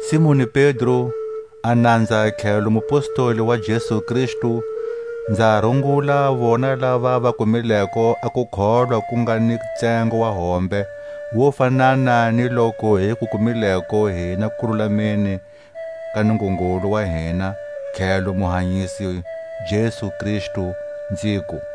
Simoni Pedro, a nanza tlhelo mupostoli wa Jesu Kristu, nza rungula vona lava va kumileko a kukholwa ku nga ni tsengo wa hombe wo fanana ni loku hi ku kumileko hina kululameni ka Nungungulu wa hina tlhelo Muhanyisi Jesu Kristu, nziku: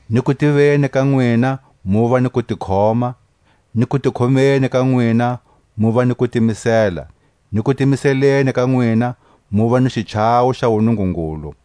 ni kutiveni ka nwina muva ni kutikhoma; ni kutikhomeni ka nwina muva ni kutimisela; ni kutimiseleni ka nwina muva ni xichawo xa wuNungungulu;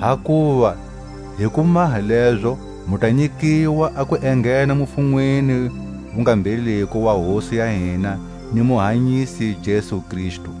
hakuva hi ku maha lezo mu ta nyikiwa a ku enghena mufunweni wu nga mbheliko wa Hosi ya hina ni Muhanyisi Jesu Kristu.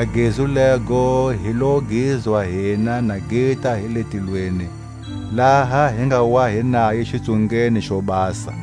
A gezu lego hi lo gizwa hina na gita hi le tilweni, laha hi nga wa hi naye xitsungeni xo basa.